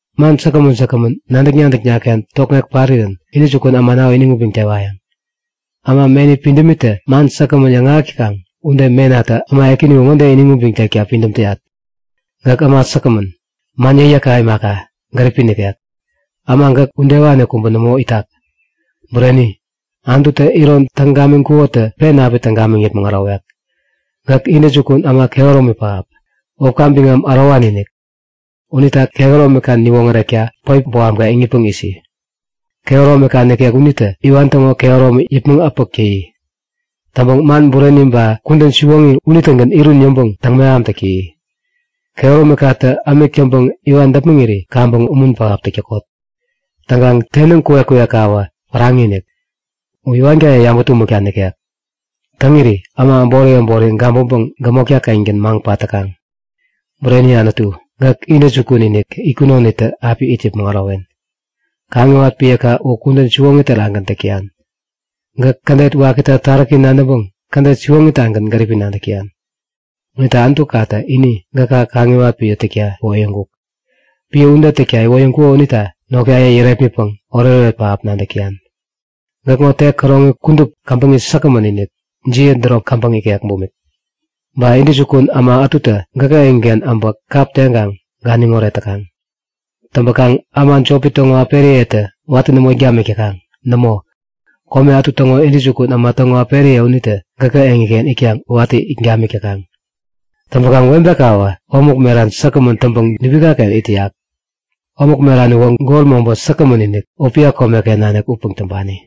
Man säkgämän säkgämän nadäk-nadäkna-ken tokŋek parirän intäjukun äma u iniŋ ubiŋpäŋ tewayäŋ. Äma meni pidämitä man säkgämän yäŋahäk täkaŋ ude menatä äma ekäni u ŋode iniŋ ubiŋ tekta pidäm täyat; Gäk äma säkgämän, man yäkyäkka imaka, gäripi nikek. Äma gäk udewani kubä nämo itak. Bureni, Anututä iron täŋ gamiŋkukotä pen api täŋ gamiŋ yäpmäŋ ärowek. Gäk intäjukun äma kehäromi pähap, wäpka biŋam ärowani-inik. Unita kehäromika niwoŋärekta päip bohamka iŋitpäŋ isi! Kehäromika nikek unitä iwan täŋo kehäromi yäpmäŋ äpäk täyi. Täŋpäŋ man bureni ba kudän siwoŋi unitägän irun yäŋpäŋ täŋ-mehamtak täyi. Kehäromikatä ämik täŋpäŋ iwan däpmäŋirän kaŋpäŋ umun pähap täk täkot! Täŋkaŋ tenäŋ kuwek-kuwekkawä päraŋi-inik. U iwankaye yabä-tumäkta nikek. Täŋiri äma äbori äbori gabäŋpäŋ gämotka-kengän maŋ pat täkaŋ. Bureni Anutu, gäk intäjukun-inik itkunonitä api it yäpmäŋ ärowen. Kaŋiwat piäka u kudän siwoŋi terakgän täk täyan. Gäk kädet wakita taräki nadäŋpäŋ kädet siwoŋitagän gäripi nadäk täyan. Unita Anutukatä ini gäkä kaŋiwat piä täkta iwoyäŋkuk. Piä ude täkta iwoyäŋkuko unita notkaye yärepmitpäŋ oretoret pähap nadäk täyan. Gäkŋo tek käroŋi kudup käbäŋi säkgämän-inik, jiä däropä käbäŋ ikek bumik. Ba intäjukun äma ätutä gäkä eŋiken abä kap teŋkaŋ ganiŋoret täkaŋ. Täŋpäkaŋ äma jopi täŋo äperiyetä watä nämo it gamik täkaŋ. Nämo, kome ätu täŋo intäjukun äma täŋo äperiye unitä gäkä eŋiken itkaŋ watä it gamik täkaŋ. Täŋpäkaŋ webekawä omäk meran säkgämän täŋpäŋ dubikaken it täyak. Omäk meran uwä gol mobä säkgämän-inik, Opia komeken nanik upäŋ täŋpani.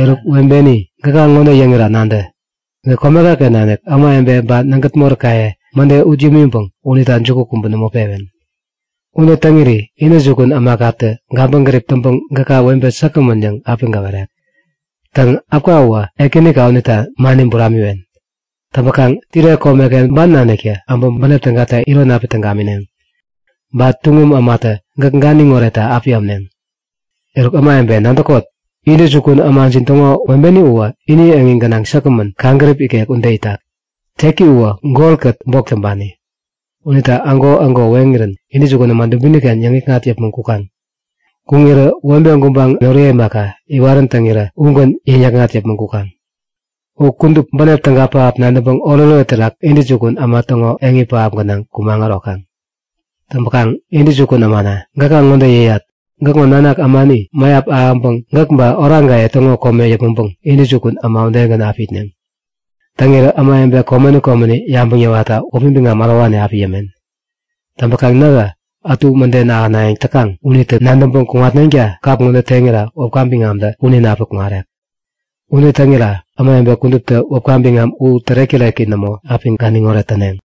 Eruk webeni, gäka ŋode yäŋira nadä; Gäk komekaken nanik ämawebe ba nägät moräkaye mäde ut yämiŋpäŋ unita juku kubä nämo pewen. Ude täŋiri intäjukun ämakatä gabäŋgärip täŋpäŋ gäka webe säkgämän yäŋ api gäwerek. Täŋ äpka uwä ekänika unita mani buramiwen. Täŋpäkaŋ Tire komeken ban naniktä äbä bänep tägata iron api täŋ gamineŋ, ba tuŋum ämatä gäk ganiŋ oretta api ämneŋ. Eruk ämawebe, nadäkot! Intäjukun ämajin täŋo webeni uwä ini eŋi gänaŋ säkgämän, kaŋgärip ikek ude itak. Teki uwä golkät bok täŋpani, unita ägo-ägo weŋirän intäjukun äma dubiniken yäŋikŋat yäpmäŋ kukaŋ. Kuŋirä webe gubaŋ noriye imaka, iwarän täŋirä ugän yäŋ-yäkŋat yäpmäŋ kukaŋ. U kudup, bänep täga pähap nadäŋpäŋ oretoret terak intäjukun äma täŋo eŋi pähap gänaŋ kumaŋ ärokaŋ. Täŋpäkaŋ intäjukun ämana, gäka ŋode yäyat; Gäkŋo nanak ämani mäyap ahäŋpäŋ gäk ba oraŋkaye täŋo kome yäpmäŋpäŋ intäjukun äma udegän api itneŋ. Täŋirä ämawebe komeni komeni yabäŋ yäwatta wäpi biŋam ärowani api yämen. Täŋpäkaŋ nähä ätu mäden ahänayäŋ täkaŋ unitä nadäŋpäŋ kuŋatneŋta kap ŋo teŋira wäpka biŋamtä punin api kuŋarek. Ude täŋira ämawebe kuduptä wäpka biŋam u tärek-täreki nämo api ganiŋoret täneŋ.